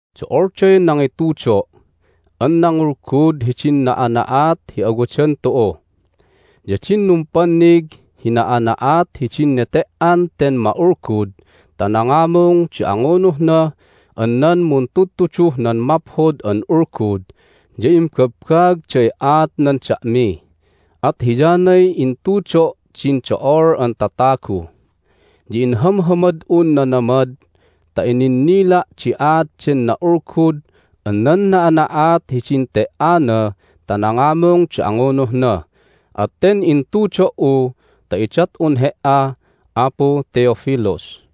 Do'olday nangitudo' an nangulgud hidin na'ana'at hi awadan tu'u. Ya din numpannig hi na'ana'at hidin nete"an ten ma'ulgud ta nangamung di angunuhna an nan muntudtuduh nan Maphod an Ulgud ya imbabbaagday aatnan da'mi, at hiyanay intudo' din do'ol an tatagu. Ya inhamhamad'un nanamad ta ininnila' di aat den na'ulgud an nan na'ana'at hidin te"ana ta nangamung di angunuhna, at ten intudo"u ta idat'un he"a, Apu Theophilus,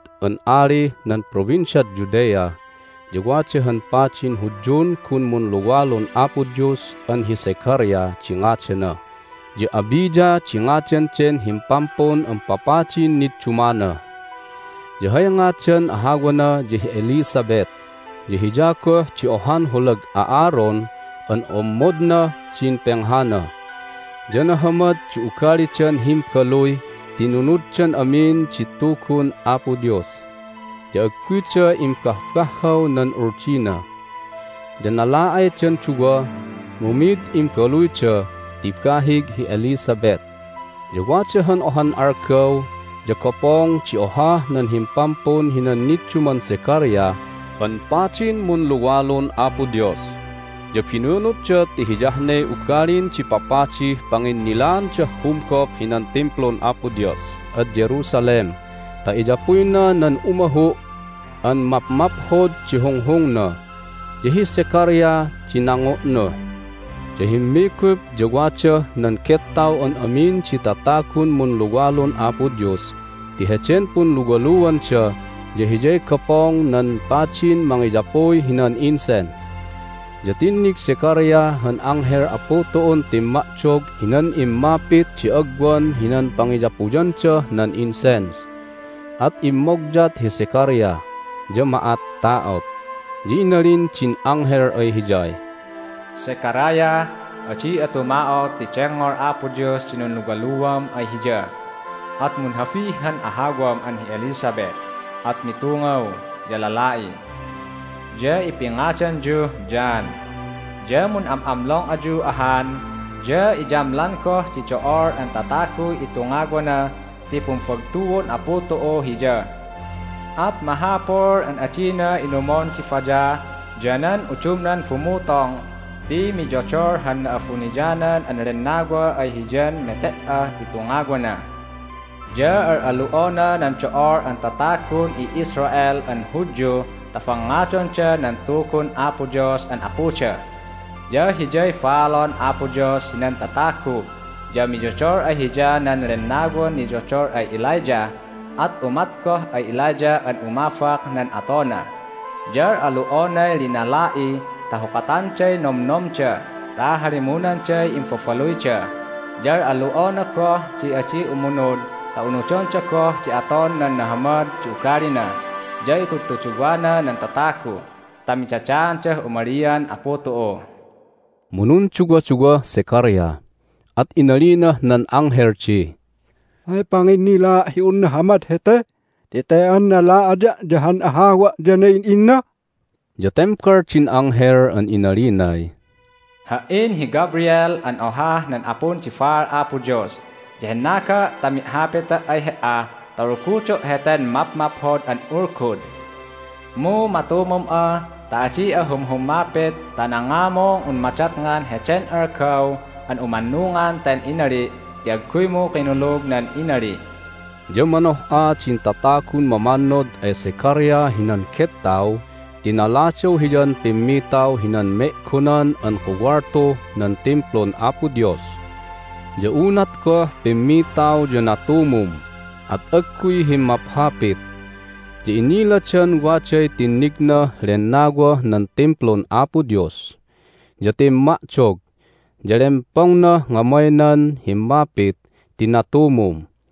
Din atagun Herod an alih nan Provinciad Judea ya wada han padin Hudyun gun munluwalun Apo Dios an hi Zechariah di ngadana, ya Abijah di ngadan den himpampun an papadin niddumana. Ya hay ngadan ahawana ya hi Elizabeth, ya hiya goh di ohan holag Aaron an ommodnah din penghana. Ya nahamad di ugalidan himbaluy ti inunuddan amin di Tugun Apo Dios, ya agguyda imbahbahhaw nan Uldina. Ya nala'aydan duwa, mu mid imbaluyda ti bahig hi Elizabeth. Ya wada han ohan algaw ya gopong di ohah nan himpampun hinan nidduman Zechariah an padin an munluwalun Apo Dios. Ya binunutda ti hiyah ne ugalin di papadih panginnilaandah humgop hinan Timplun Apo Dios ad Jerusalem ta iyapuyna nan umahu' an mapmaphod di hunghungna, ya hi Zechariah di nangu'nuh. Ya himmigup, ya wadah nan gettaw an amin di tatagun munluwalun Apo Dios ti heden punluwaluanda ya hiyay gopong nan padin mangiyapuy hinan incense. Ya tinnig Zechariah han anghel Apu tu'un timma'dog hinan immapit di agwan hinan pangiyapuyandah nan incense, at immogyat hi Zechariah, ya ma'atta'ot. Ya inalin din anghel ay hiyay, "Zechariah, adi'a tuma'ot ti dengngol Apo Dios din nunluwaluam ay Hiya, at munhabi han ahawam an hi Elizabeth, at mitungaw, ya lala'i. Ya ipingadanyuh John. Ya mun'am'amlong ayu ahan, ya iyamlan goh di do'ol an tataguy itungawana ti pumbagtuon Apu tu'u hiya. At mahapul an adina inumon di bayah ya nan udumnan bumutong ti miyodol han Na'abuniyanan an Lennawa ay hiyan mete"ah itungawana. Ya al'alu'ona nan do'ol an tatagun i'Israel an Hudyu ta bangngadonda nan Tugun Apo Dios an Apuda. Ya hiyay baalon Apo Dios hinan tatagu, ya miyodol ay hiya nan lennawan niyodol ay Elijah, at umat goh ay Elijah an umabak nan atona. Ya al'alu'onay linala'i ta hukatanday nomnomda ta halimunanday imbabaluyda, ya al'alu'ona goh di adi umunud ta unudonda goh di aton nan nahamad di ugalina, ya itudtuduwana nan tatagu ta midadaandah umalian Apu tu'u." Mu nunduwaduwah Zechariah, at inalinah nan anghel di, "Hay panginnilaa' hi un nahamad hete ti te an nala'aya', ya han ahawa' ya na'in'inna?" Ya tembal din anghel an inalinay, "Ha"in hi Gabriel an ohah nan apun di baal Apo Dios, ya hennaga' ta mi'hapita' ay he"a ta ulgudo' heten mapmaphod an ulgud. Mu matumum'a ta adi'a humhummapit ta nangamung un madatngan heden algaw an umannungan ten inali' ti agguymu kinulug nan inali'." Ya manoh'a din tatagun mamannod ay Zechariah hinan gettaw ti naladaw hiyan pimmitaw hinan Me'gonan an Kuwaltuh nan Timplun Apo Dios. Ya unat goh pimmitaw ya natumum, at agguy himmaphapit. Ya iniladan waday tinnignah lennawah nan Timplun Apo Dios. Ya timma'dog, ya lempongnah ngamaynan himmapit ti natumum.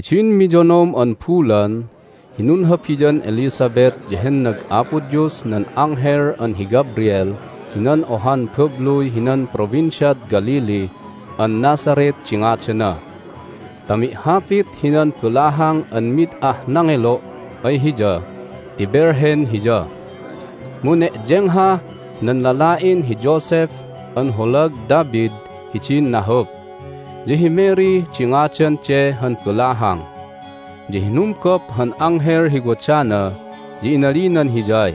Hidin miyonom an bulan hi nunhabian Elizabeth ya hennag Apo Dios nan anghel an hi Gabriel hinan ohan babluy hinan Provinciad Galilee an Nazareth di ngadana ta mi'hapit hinan balahang an mid ah nangelo' ay hiya ti velhen hiya. Mu ne'yenghah nan lala'in hi Joseph an holag David hidin nahup. Ya hi Mary di ngadan de han balahang. Ya hinumgop han anghel hi wadana, ya inalinan hiyay,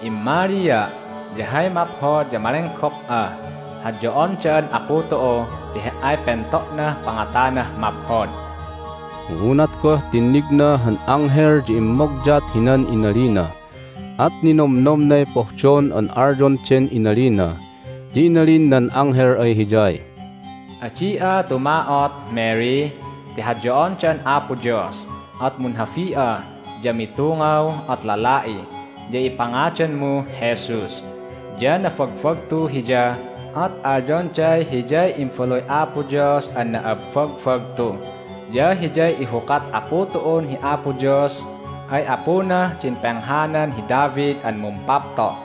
"Immalia', ya hay maphod ya malenggop'a! Hadyo'on da'an Apu tu'u ti he"ay pento'nah pangatanah maphod!" Mu unat goh tinnigna han anghel ya immogyat hinan inalina, at ninomnomnay pohdon an alyon den inalina. Ya inalin nan anghel ay hiyay, "Adi'a tuma'ot, Mary, ti hadyo'on da'an Apo Dios! At munhabi'a, ya mitungaw, at lala'i, ya ipingadanmuh Jesus. Ya nabagbagtu Hiya, at alyonday Hiyay Imbaluy Apo Dios an na'abbagbagtu, ya Hiyay ihukat Apu tu'un hi Apo Dios ay apunah din penghanan hi David an mumpapto'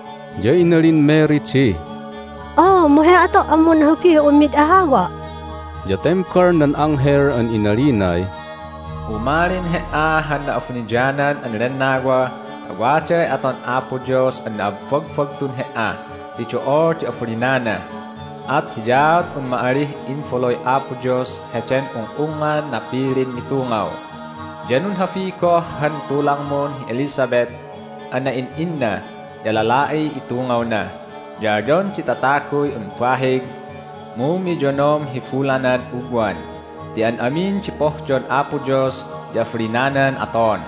Ya inalin Mary di, "Oo, mu hay ato' an munhabih un mid ahawa'?" Ya tembal nan anghel an inalinay, "Umalin he"a han Na'abuniyanan an Lennawa, ya waday aton Apo Dios an na'abbagbagtun he"a ti do'ol di abalinana. At hiyaat un ma'alih Imbaluy Apo Dios heden ung'ungngan napilin mitungaw. Ya nunhabi goh han tulangmun hi Elizabeth an na'in'inna, ya lala'iy itungawna. Ya alyon di tataguy un bahig, mu miyonom hi bulanad ugwan. Ti an amin di pohdon Apo Dios ya abalinanan aton."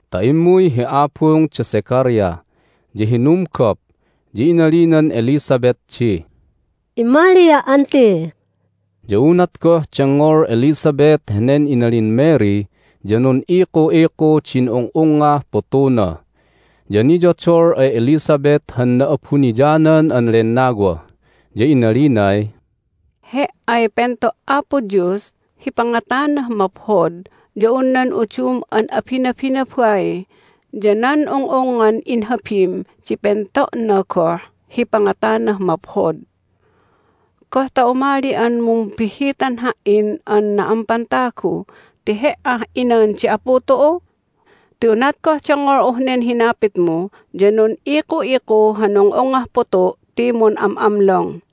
ta immuy hi abung da Zechariah. Ya hinumgop, ya inalinan Elizabeth di, "Immalia', aunti'!" Ya unat goh dengngol Elizabeth henen inalin Mary ya nun'iku'iku din ung'ungngah putuna. Ya niyodol ay Elizabeth han Na'abuniyanan an Lennawa, ya inalinay, "He"ay pento' Apo Dios hi pangatanah maphod ya un nan udum an abinabinabai, ya nan ung'ungngan inhabim di pento'na goh hi pangatanah maphod! Goh ta umali'an mumbihhitan ha"in an na'ampan tagu ti he"ah inan di Apu tu'u? Ti unat goh dengngol'uh nen hinapitmu ya nun'iku'iku han ung'ungngah putu' ti mun'am'amlong!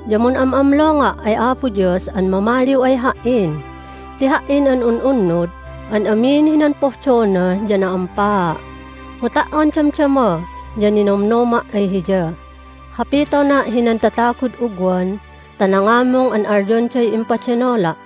ya mun'am'amlonga' ay Apo Dios an mamaliw ay ha"in ti ha"in an un'unnud an amin hinan pohdona ya na'ampaa', mu ta"on damdama ya ninonomnoma' ay Hiya! Hapitona' hinan tatagud ugwan ta nangamung an alyonday impadenola'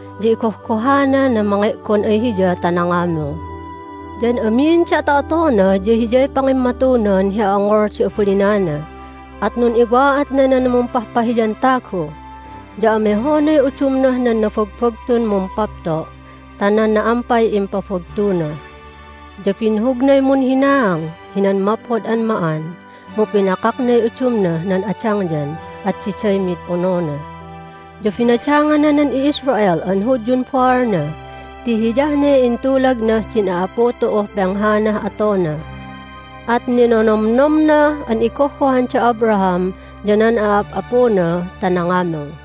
ya igohgohana nan mange'gon ay Hiya ta nangamung. Ya an amin di ato'atona ya hiyay pangimmatunan hi a'ongol di abalinana, at nun'iwa'atna nan mumpahpahiyan tagu. Ya amehonay udumnah nan nabagbagtun mumpapto' ta nan na'ampay impabagtuna. Ya binhugnay munhinaang hinan maphod an ma'an, mu pinakaknay udumnah nan adangyan, at diday mid onona. Ya binadangana nan i'Israel an Hudyun baalna ti hiyah ne intulagnah din a'apu tu'uh penghanah atona. At ninonomnomna an igohgohan da Abraham ya nan a'ap'apuna ta nangamung!"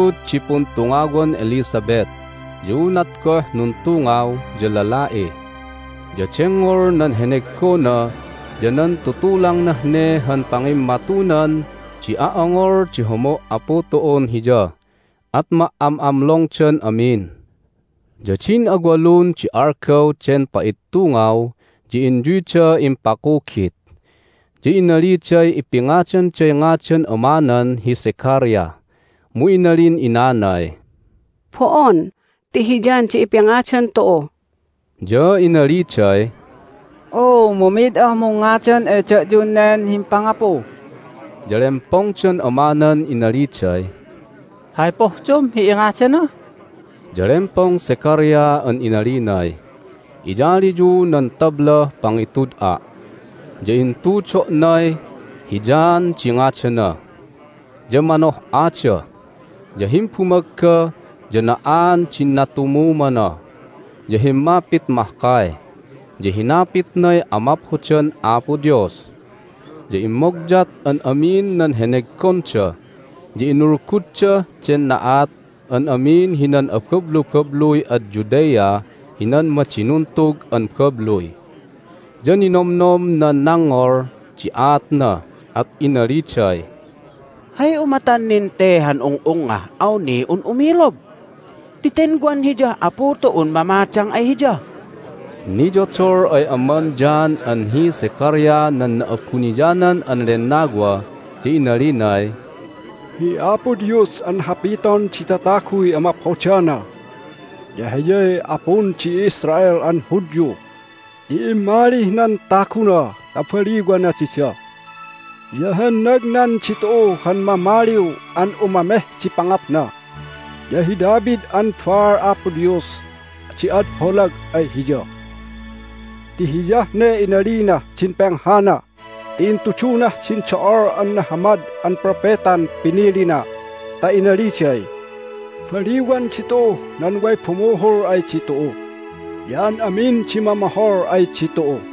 Nagtud di puntungawan Elizabeth. Ya unat goh nuntungaw ya lala'i. Ya dengngol nan heneggona ya nan tutulangnah ne han pangimmatunan di a'ongol di homo' Apu tu'un hiya, at ma"am'amlongdan amin. Ya din awalun di algaw den pa'ittungaw ya inyuyda impakugit. Ya inaliday ipingadanday ngadan amanan hi Zechariah, mu inalin inanay, "Bo'on! Ti hi John di ipingadan tu'u." Ya inaliday, "Oo, mu mid ah mungngadan ay da'yun nen himpangapu!" Ya lempongdan amanan inaliday, "Hay pohdom hi ingadana?" Ya lempong Zechariah an inalinay, "Iyaliyu nan tablah pangitud'a'." Ya intudo'nay, "Hi John di ngadana." Ya manoh'ada! Ya himbumagga ya na'aan din natumumana, ya himmapit mahkay, ya hinapitnay amaphodan Apo Dios. Ya immogyat an amin nan heneggonda, ya inulguddah den na'at an amin hinan abablubabluy ad Judea hinan madinuntug an babluy. Ya ninomnom nan nangngol di aatna, at inaliday, "Hay umatan nin te han ung'ungngah awnih un umilog? Ti ten wan hiyah Apu tu'un mamadang ay hiya!" Hay Inulgud Zechariah Niyodol ay aman John an hi Zechariah nan Na'abuniyanan an Lennawa, ya inalinay, "Hi Apo Dios an hapiton di tataguy amaphodana ya Hiyay Apun di i'Israel an Hudyu ti immalih nan taguna ta baliwana dida! Ya hennagnan ditu'u han Mamaliw an umameh di pangatna, ya hi David an baal Apo Dios di ad holag ay Hiya. Ti hiyah ne inalinah din penghana ti intudunah din do'ol an nahamad an propetan pinilina ta inaliday, Baliwan ditu'uh nan way bumuhul ay ditu'u, ya an amin di mamohol ay ditu'u.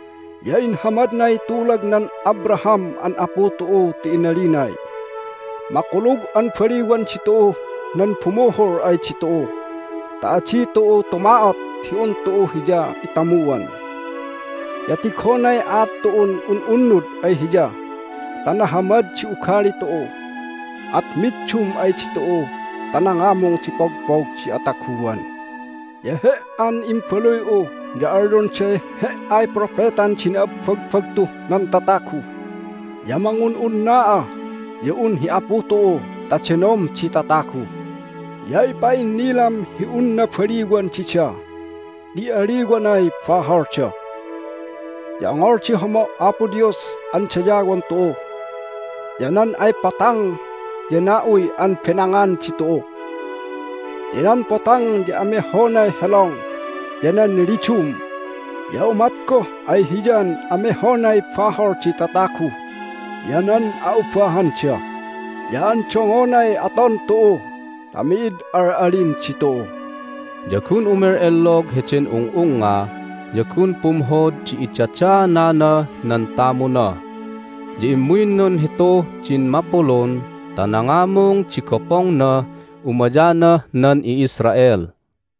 Ya inhamadnay tulagnan Abraham an apu tu'u ti inalinay, Makulug an baliwan ditu'uh nan bumuhul ay ditu'u ta adi tu'u tuma'ot hi un tu'u Hiya itamuan. Ya tigonay aat tu'un un'unnud ay Hiya ta nahamad di ugali tu'u, at middum ay ditu'u ta nangamung di pogpog di ataguan. Ya he"an imbaluy'u ya alyonday he"ay propetan di na'abbagbagtuh nan tatagu, ya mangun'unna'a ya un hi Apu tu'u ta denom di tatagu, ya ipa'innilam hi unna baliwan dida ti aliwanay baholda. Ya ongol di homo' Apo Dios an dayawon tu'u, ya nan ay potang ya na'uy an benangan ditu'u ti nan potang ya amehonay helong ya nan lidum, ya umat goh ay Hiyan amehonay bahol di tatagu ya nan a'ubahanda, ya andongonay aton tu'u ta mi'id al'alin ditu'u." Ya gun umel'ellog heden ung'ungnga, ya gun pumhod di idadaananah nan tamuna. Ya immuy nunhituh din mapulun ta nangamung di gopongnah umayanah nan i'Israel.